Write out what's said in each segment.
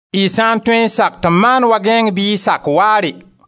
Y sã n tõe n sak tɩ m maan wa gãeeng bɩ y sak waare!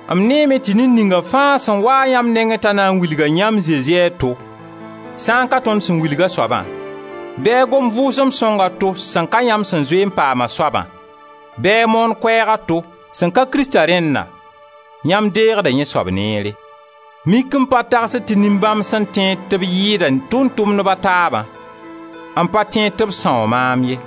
M neeme tɩ ned ninga fãa sẽn wa-a yãmb nengẽ t'a na n wilga yãmb Zezi a to, sẽn ka tõnd sẽn wilg a soabã, bɩ a gom Vʋʋsem Sõng a to sẽn ka yãmb sẽn zoe n paam a soabã, bɩ a moon koɛɛg a to sẽn ka Krista rẽnna, yãmb deegda yẽ soab neere. Mik m pa tagsd tɩ nin-bãmb sẽn tẽed tɩ b yɩɩda tʋʋm-tʋmdb a taabã, m pa tẽed tɩ b sãoo maam ye.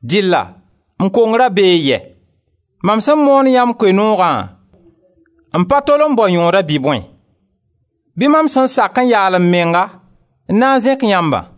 Dɩlla m kongra bee yɛ? Mam sẽn moon yãmb Koe-noogã n pa tol n bao yõoda bɩ bõe? Bɩ mam sẽn sak n yaal m menga n na n zẽk yãmbã?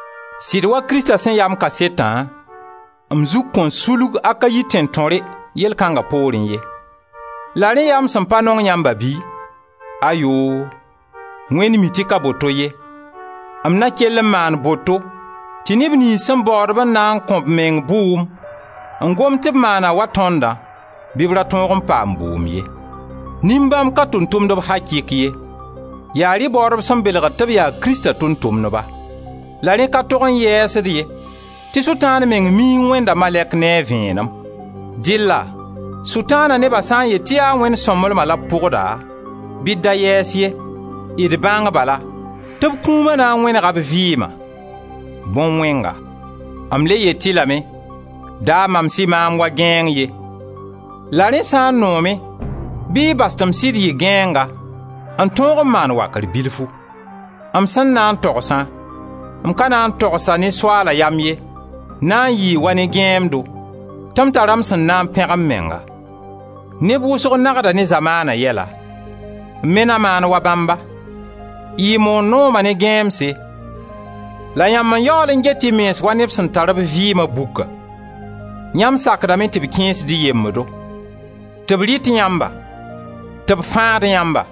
Sɩd wa Krista sẽn ya m kasetã, m zug kõn sulg Akayi tẽn-tõre, yell kãnga poorẽ ye. La rẽ ya m sẽn pa nong yãmba bɩ? Ayoo! Wẽnd mi tɩ ka boto ye. M na kell n maan boto tɩ neb niyns sẽn baood-b n na n kõ b meng bʋʋm, n gomd tɩ b maana wa tõndã, bɩ b ra tõog n paam bʋʋm ye. Nin-bãmb ka tʋʋm-tʋmdb akɩk ye, yaa rɩ baoodb sẽn belg tɩ b yaa Krista tʋʋm-tʋmdba. La rẽ ka tog n yɛɛs-d ye tɩ Sʋtãan meng mi n wẽnda malɛk ne a vẽenem. Dɩlla Sʋtãana neba sã n yet tɩ yaa Wẽnd sõmblema la b pʋgda, bɩ d da yɛɛs ye. D bãng bala tɩ b kũuma na n wẽnega b vɩɩma: bõn-wẽnga. M le yet-y lame, da mams-y maam wa gãeeng ye; la rẽ sã n noom-y bɩ y bas tɩ m sɩd yɩ gãeenga n tõog n maan wakr bilfu. M sẽn na n togsã, m ka na n togs-a ne Soaala yam ye, na n yɩɩ wa ne gãeemdo, tɩ m tara m sẽn na n pẽg m menga. Neb wʋsg nagda ne zamaana yɛla. M me na maan wa bãmba. Y moor nooma ne gãeemse la yãmb n yaool n get y mens wa neb sẽn tar b vɩɩma buka. Yãmb sakdame tɩ b kẽesd-y yembdo, tɩ b rɩt yãmba, tɩ b fãad yãmba,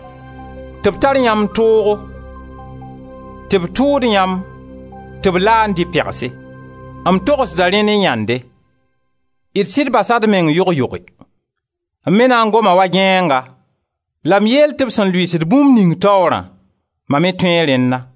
tɩ b tar yãmb toogo, tɩ b tʋʋd yãmb, tɩ b laand-y pegse. M togsda rẽ ne yãnde; d sɩd basa d meng yog-yoge. M me na n goma wa gãeenga la m yeel tɩ b sẽn lʋɩɩsd bũmb ning taoorã, ma me toe rẽnna.